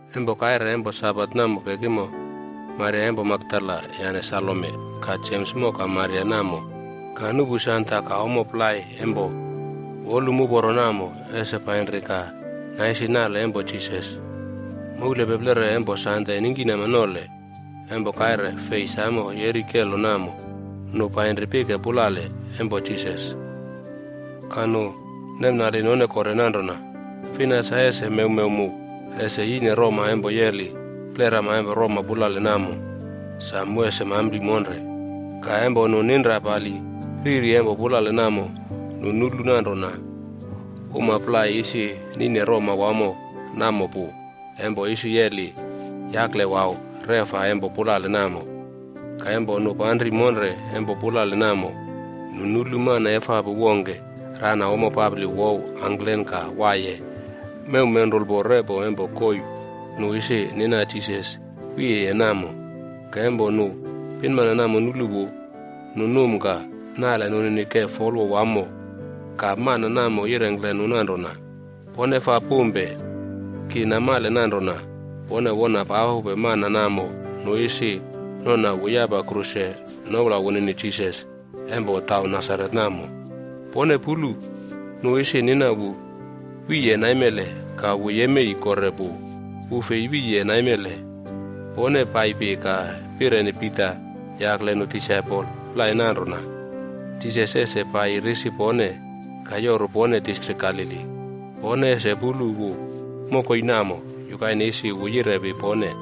Empo kaire empo Sabat namo pekimo, Maria empo Makdala yane Salome ka Jems moka Maria namo painri ka nuꞌpu sanda ka ommo plai empo wolum uporo namo ese painri ka naisi nale empo Jisas. Moulpeplere empo Sande ningkinama nole empo kaire fei samo yeri kelo namo, nu painri pike pulale empo Jisas. Ka nu nemnali none kore nanrona, “Fina sa ese mewmew mu ese yine roma empo yeli plerama empo roma pulale namo, sa mu ese mampli monre?” Ka empo nu ninra pali riri empo pulale namo, nu nulu nanrona uma plai isi nine roma wamo namo pu empo isi yeli yaklewau reꞌfa empo pulale namo. Ka empo nu panri monre empo pulale namo, nu nulu mana efapu wongke rana ommo papli wouw angklen ka waiye mew menrulpo repo empo koii nu isi nina Jisas wiyeye namo. Ka empo nu pinmana namo nulu wu, nu num ka nale nunini ke folwo wamo. Ka mana namo yirengkle nu nanrona, “Pone faa pumpe. Ki namale nanrona pone wona papupe mana namo nu isi nona wu yapa kruse noula wunini Jisas empo taun Nasaret namo. Pone pulu, nu isi nina wu wiye naimele. Ka wu yemei kore pu! Wu fei wiye naimele. Pone paipi ka pireni Pita yakle nu disaipol plai nanrona, ‘Jisas ese paiyi risi pone ka yoru pone distrik Galili. Pone ese pulu wu mokoi namo, yukaine isi wu yirepi pone.’”